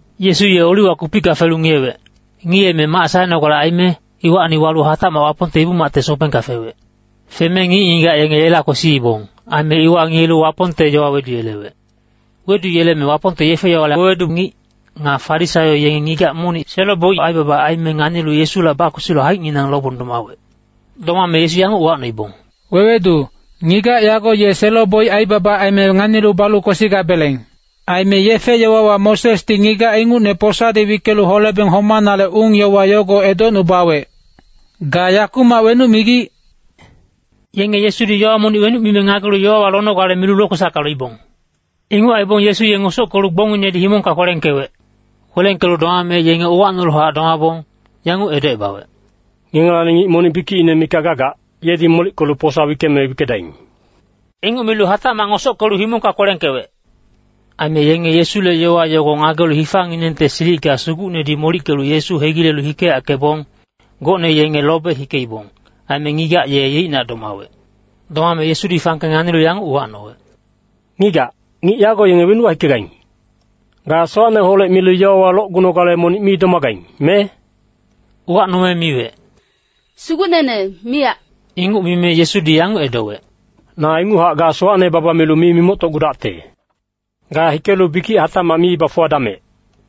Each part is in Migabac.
Yesu ye Oliwa kupicka felu ngiyewec. Ngiyeme mac saenogale aime, iwacni walu hatacmac Wapongte Ibu-macte sobengka fewec. Feme ngic-ngigac yenge yela kwesiibong. Aime iwa ngiyelu Wapongte yowa weduyelewec. Weduyeleme Wapongte yefe-yowale wewedu ngic, nga Farisaio yenge ngigac monic selo-boic aibaba aime nganilu Yesula bakwesilu haicnginang lobong domawec. Domame Yesu yanguc uwacnoibong, “Wewedu, ngigac yago ye selo-boic aibaba aime nganilu balu kwesigabeleng. Aime yefe-yowawa Mosesdi ngigac ingucne posadi wickelu holebeng homanale ung-yowa yogo edocnubawec. Ga yakumac wenuc migic?” Yenge Yesudi yowa monic wenuc mime ngagelu yowawa lonogale milu lokwesacka loibong. Inguc aibong Yesu ye ngosockelu gbongnginedi himongka kwelengkewec. Kwelengkelu domame yenge uwacnoluhac domabong, yanguc edocebawec, “Ngengelacni ngic monic bikicine mikac gagac, yedi molickelu posa wickeme wickedaing.” Inguc milu hatacmac ngosockelu himongka kwelengkewec. Aime yenge Yesule yowa yogo ngagelu hifanginengte silicka sugucnedi molickelu Yesu hegilelu hikeyackebong, gocne yenge lobe hikeibong. Aime ngigac ye yeicnac domawec. Domame Yesudi fangke nganilu yanguc uwacnowec, “Ngigac, ngic yago yenge wenuwa hikegaing? Ga sowacneholec milu yowawa locgunogale monic mi domagaing, me?” Uwacnome miwec, “Sugucnene, miyac.” Inguc mime Yesudi yanguc edowec, “Na inguchac ga sowacne baba milu mi mimoctocgudacte. Ga hikelu bikic hatacmac mi bafuwadamec.”]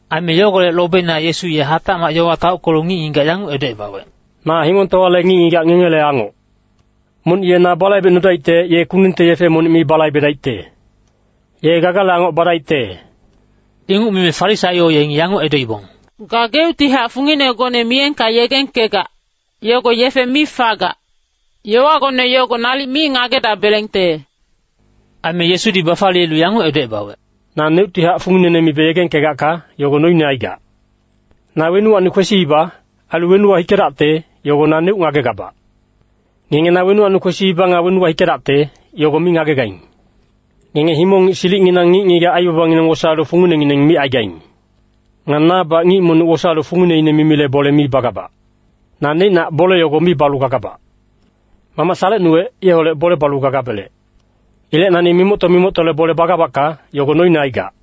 Aime yogolec lobeina Yesu ye hatacmac yowa taockelu ngic-ngigac yanguc edocebawec, “Na himongtowale ngic-ngigac ngengele angoc. Monic ye na balaibecnudaicte, ye kundungte yefe monic mi balaibedaicte. Ye gagale angoc badaicte.” Inguc mime Farisaio yengi yanguc edoibong, “Gageuctihac funginegone miyengka yegengkegac, yogo yefe mi fagac. Yowagone yogo nalic mi ngagedabelengte.” Aime Yesudi bafaliyelu yanguc edocebawec, “Naneuctihac funginene mibe yegengkegacka, yogo noine aigac. Na wenuwacni kwesiiba, ailu wenuwa hikedacte, yogo naneuc ngagegabac. Ngenge na wenuwacni kwesiiba nga wenuwa hikedacte, yogo mi ngagegaing. Ngenge himong-ngic silicnginang ngic-ngigac aibabangineng wosaelu funginengineng micaigaing. Nga nabac ngic monic wosaelu fungineine mimile bole mi bagabac. Na neicnac bole yogo mi balu gagabac. Mamac salecnuwec, yeholec bole balu gagabelec. Ilec nani mimocto-mimoctole bole bagabacka, yogo noine aigac.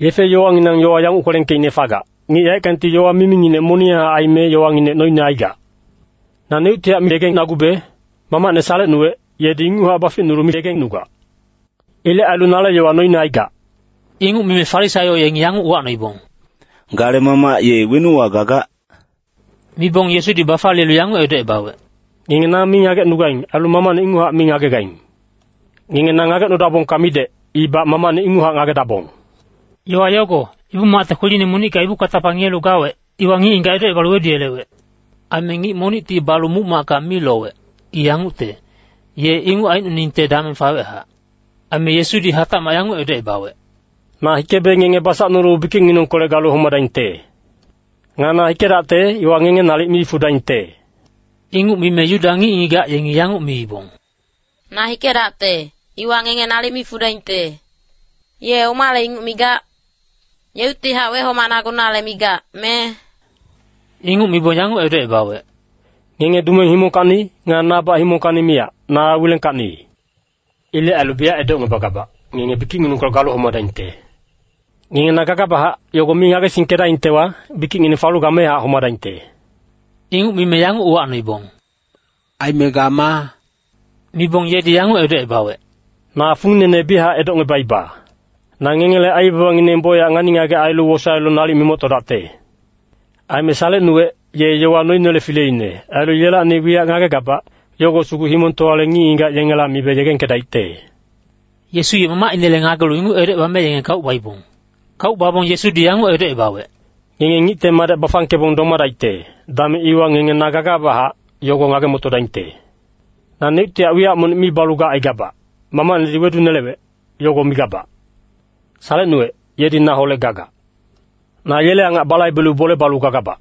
Yefe-yowanginang yowa yanguc kwelengkeicne fagac, ‘Ngic yaeckangti yowa miminginec moniyanghac aime yowanginec noine aigac.’ Naneuctihac miyegengnagube, Mamacne salecnuwec, yedi inguchac baficnulu miyegengnugac. Ilec ailu nale yowa noine aigac.” Inguc mime Farisaio yengi yanguc uwacnoibong, “Gale mamac ye wenuwa gagac?” Mibong Yesudi bafaliyelu yanguc edocebawec, “Ngenge na mi ngagecnugaing, ailu Mamacne inguchac mi ngagegaing. Ngenge na ngagecnudabongka midec, ibac Mamacne inguchac ngagedabong.” Yowa yogo, Ibu-macte kweline monicka ibu katapa ngiyelu gawec, iwa ngic-ngigac edocebalu weduyelewec. Aime ngic monicti balu muc-macka mi lowec. I yangucte, ye inguc aicnoningte dameng fawechac. Aime Yesudi hatacmac yanguc edocebawec, “Na hikebe ngenge basacnulu bikicnginengkolec galu homadaingte. Nga na hikedacte, iwa ngenge nalic mi fudaingte.” Inguc mime Yuda ngic-ngigac yengi yanguc miibong, “ ‘Na hikedacte, iwa ngenge nalic mi fudaingte.’ Ye omale inguc migac? Yeuctihac wehomanagunale migac, me?” Inguc mibong yanguc edocebawec, “Ngenge dumeng himongkacni, nga nabac himongkacni miyac, na wilengkacni. Ilec ailu biyac edocngebagabac, ngenge bikicnginengkolec galu homadaingte. Ngenge na gagabachac, yogo mi ngagesingkedaingtewa, bikicngineng falu gamehac homadaingte.” Inguc mime yanguc uwacnoibong, “Aime ga maa?” Mibong yedi yanguc edocebawec, “Na funginene biyachac edocngebaiba. Na ngengele aibabangineng bocyac ngani-ngagec ailu wosaelu nalic mimoctodacte. Aime salecnuwec, ye yowa noinele fileine, ailu yelacni wiyac ngagegabac, yogo sugu himongtowale ngic-ngigac yengela mibe yegengkedaicte.” Yesu ye Mamacinele ngagelu inguc edocebame yenge kauc baibong. Kauc babong Yesudi yanguc edocebawec, “Ngenge Ngicte Madec bafangkebong domadaicte, dameng iwa ngenge ‘na gagabachac,’ yogo ngage-motodaingte. Naneuctihac wiyac monic mi balu gacaigabac, Mamacnedi wedunelewec, yogo migabac. Salecnuwec, yedi naholec gagac. Na yele angac balaibelu bole balu gagabac.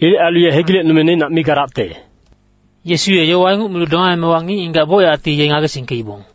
Ilec ailu ye hegilecnume neicnac mi gadacte.” Yesu ye yowa inguc milu domaemewa ngic-ngigac bocyacti ye ngagesingkeibong.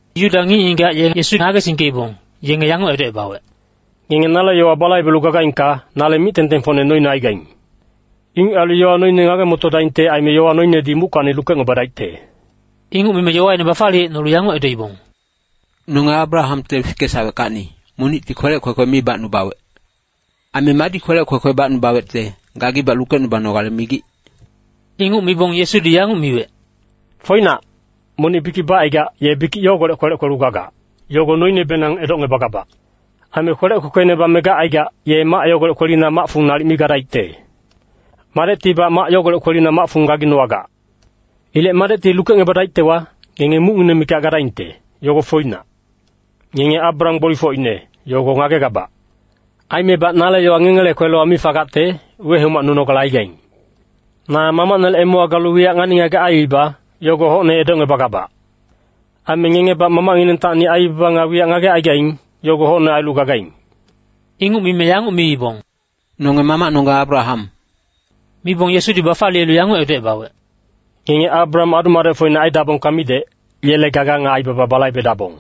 Yuda ngic-ngigac yenge Yesu ngagesingkeibong, yenge yanguc edocebawec, “Ngenge nale yowa balaibelu gagaingka, nale mic-tengtengfocne noine aigaing. Inguc ailu yowa noine ngage-motodaingte aime yowa noinedi muckacni lukecngebadaicte.” Inguc mime yowaine bafaliyecnolu yanguc edoibong, “Nonge Abrahamte fikesaweckacni, monicti kwelec kwekwe mi bacnubawec. Aime madi kwelec kwekwe bacnubawecte, gagibac lukecnubanogale migic?” Inguc mibong Yesudi yanguc miwec, “Foinac, monic bikic bacaigac, ye bikic yogolec kwelec kwelu gagac, yogo noinebenang edocngebagabac. Aime kwelec kwekweine bame gacaigac, ye mac yogolec kwelina mac-fung nalic mi gadaicte. Madectibac mac yogolec kwelina mac-fung gaginowagac. Ilec Madecti lukecngebadaictewa, ngenge mucngineng mikac gadaingte, yogo foinac. Ngenge Abraham gbolifocine, yogo ngagegabac. Aimebac nale yowa ngengele kwelewa mi fagacte, wehomacnunogale aigaing. Na Mamacnele emewa galu wiyac ngani-ngagec aiiba, yogo hocne edocngebagabac. Aime ngengebac mamacnginengtacni aibaba nga wiyac ngagecaigaing, yogo hocne ailu gagaing.” Inguc mime yanguc miibong, “Nonge mamacnonggeng Abraham.” Mibong Yesudi bafaliyelu yanguc edocebawec, “Ngenge Abraham adu-madecfocine aidabongka midec, yele gaga nga aibaba balaibedabong.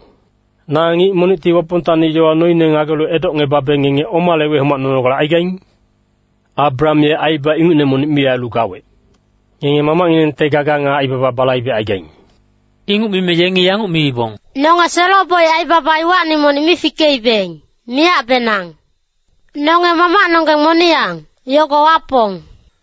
Na ngic monicti Wapongtacni yowa noine ngagelu edocngebabe ngenge omale wehomacnunogale aigaing? Abraham ye aibaba ingucne monic mi ailu gawec. Ngenge mamacnginengte gaga nga aibaba balaibecaigaing.” Inguc mime yengi yanguc miibong, “Nonge selo-boic aibaba iwacni monic mi fikeibeng, miyacbenang. Nonge Mamacnonggeng moniyang, yogo Wapong.”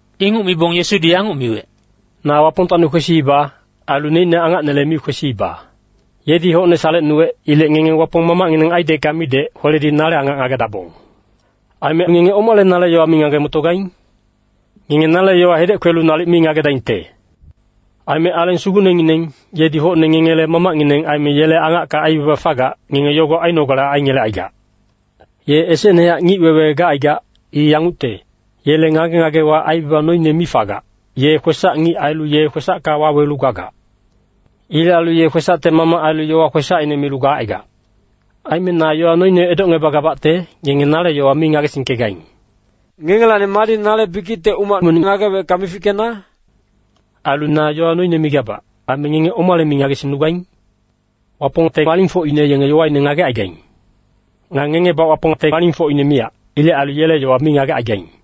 Inguc mibong Yesudi yanguc miwec, “Na Wapongtacni kwesiiba, ailu neicne angacnele mi kwesiiba. Yedi hocne salecnuwec. Ilec ngenge Wapong mamacngineng aidecka midec, kweledi nale angac ngagedabong. Aime ngenge omale nale yowa mi ngage-motogaing? Ngenge nale yowa hedec kwelu nalic mi ngagedaingte. Aime Aleng Sugucnengineng, yedi hocne ngengele mamacngineng aime yele angacka aibaba fagac, ngenge yogo ainogale aingelecaigac. Ye esecnehac ngic-wewe gacaigac. I yangucte, yele ngage-ngagewa aibaba noine mi fagac, ye kwesac-ngic ailu ye kwesacka wawelu gagac. Ilec ailu ye kwesacte mamac ailu yowa kwesacine milu gacaigac. Aime na yowa noine edocngebagabacte, ngenge nale yowa mi ngagesingkegaing. Ngengelacni madi nale bikicte umac monic ngagewecka mifickena? Ailu na yowa noine migabac, aime ngenge omale mi ngagesingnugaing? Wapongte alingfocine yenge yowaine ngagecaigaing. Nga ngengebac Wapongte alingfocine miyac. Ilec ailu yele yowa mi ngagecaigaing.”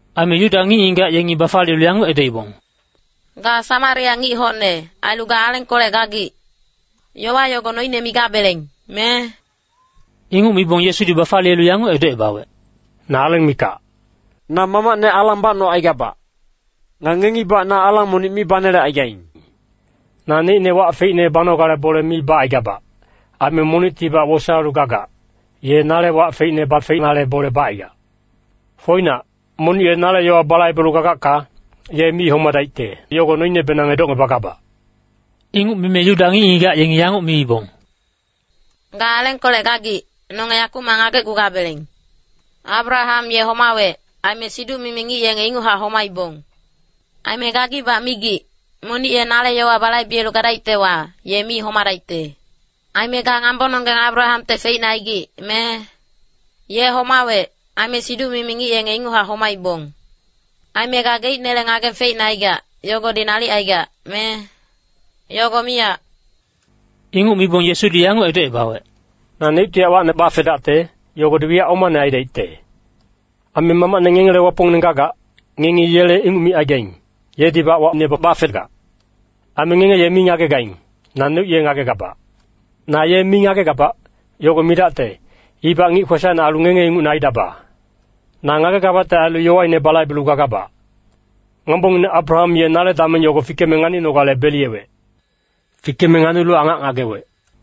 Aime Yuda ngic-ngigac yengi bafaliyelu yanguc edoibong, “Ga Samaria ngic hocne, ailu ga alengkolec gagic. Yowa yogo noine migabeleng, me?” Inguc mibong Yesudi bafaliyelu yanguc edocebawec, “Na aleng mikac. Na Mamacne alang bacnocaigabac. Nga ngengibac na alang monic mi banelecaigaing. Naneicne wac feicne banogale bole mi bacaigabac. Aime monictibac wosaelu gagac, ye nale wac feicne bafenale bole bacaigac. Foinac, monic ye nale yowa balaibelu gagacka, ye mi homadaicte, yogo noinebenang edocngebagabac.” Inguc mime Yuda ngic-ngigac yengi yanguc miibong, “Ga alengkolec gagic, nonge yakumac ngagecgugabeleng. Abraham ye homawec, aime siduc-mimi ngic yenge inguchac homaibong. Aime gagibac migic, ‘Monic ye nale yowa balaibelu gadaictewa, ye mi homadaicte.’ Aime ga ngambononggeng Abrahamte feicne aigic, me? Ye homawec, aime siduc-mimi ngic yenge inguchac homaibong. Aime gageicnele ngageng feicne aigac, yogodi nalic aigac, me? Yogo miyac.” Inguc mibong Yesudi yanguc edocebawec, “Naneuctihac wacne bafedacte, yogodi wiyac omane aidaicte. Aime Mamacne ngengele Wapongngineng gagac, ngengi yele inguc micaigaing, yedibac wacne bafegac. Aime ngenge ye mi ngagegaing, naneuc ye ngagegabac. Na ye mi ngagegabac, yogo midacte, ibac ngic kwesacine ailu ngenge ingucne aidaba. Na ngagegabacte ailu yowaine balaibelu gagabac. Ngambongineng Abraham ye nale dameng yogo fikeme nganinogale beliyewec. Fikeme nganilu angac ngagewec.”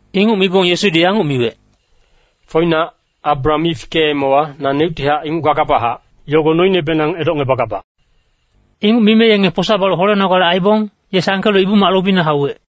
Inguc mibong Yesudi yanguc miwec, “Foinac, Abraham mi fikeemewa ‘naneuctihac inguc gagabachac,’ yogo noinebenang edocngebagabac.” Inguc mime yenge posa balu holenogale aibong, ye sangkelu Ibu-mac lobina hauwec.